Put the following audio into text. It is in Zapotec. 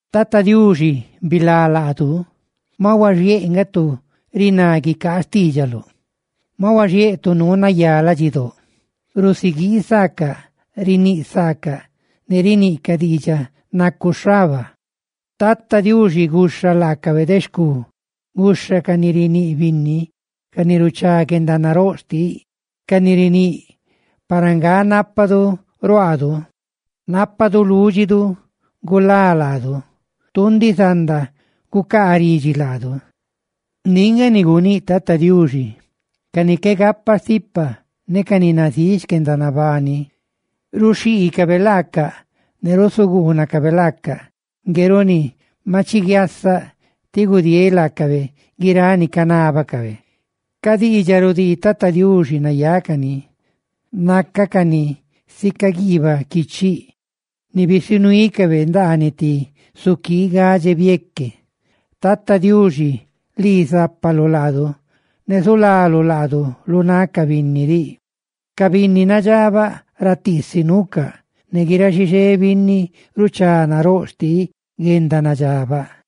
Tata Diuxi, bilá laadu, ma huaxiéꞌ nga tu riná guicaa xtiidxaluꞌ, ma huaxiéꞌ tu nuu nayá ladxidóꞌ. Rusiguii saacaꞌ; riníꞌ saacaꞌ ne riniꞌcaꞌ diidxaꞌ nacu xhaba. Tata Diuxi guxha laacabe de xcu guxha ca ni riníꞌ binni, ca ni ruchá guendanaróꞌ xtiꞌ, ca ni riníꞌ: «Para nga nápadu ruaadu; nápadu lúdxidu gulá laadu. Tu ndiꞌ zanda gucaa ridxi laadu.» Ndiꞌ nga ni guníꞌ Tata Diuxi: «Ca ni qué gapa stipa ne ca ni nazíꞌ xquendanabani ruxhiicabe laacaꞌ ne rusuguunacabe laacaꞌ. Ngue runi maꞌ chiguiasaꞌ, tí gudieeꞌ laacabe guiráꞌ ni canábacabe.» Ca diidxaꞌ rudii Tata Diuxi nayácani; ¡naca cani sica plata, ni bisunuicabe ndaaniꞌ ti suquii gadxe bieque! Tata Diuxi, lii zápaluꞌ laadu; ¡ne zulaluꞌ laadu lu náꞌ ca binni diꞌ! Ca binni nadxabaꞌ ratiisi nuucaꞌ, ne guiráꞌ xixé binni ruchá naróꞌ xtiꞌ guendanadxabaꞌ.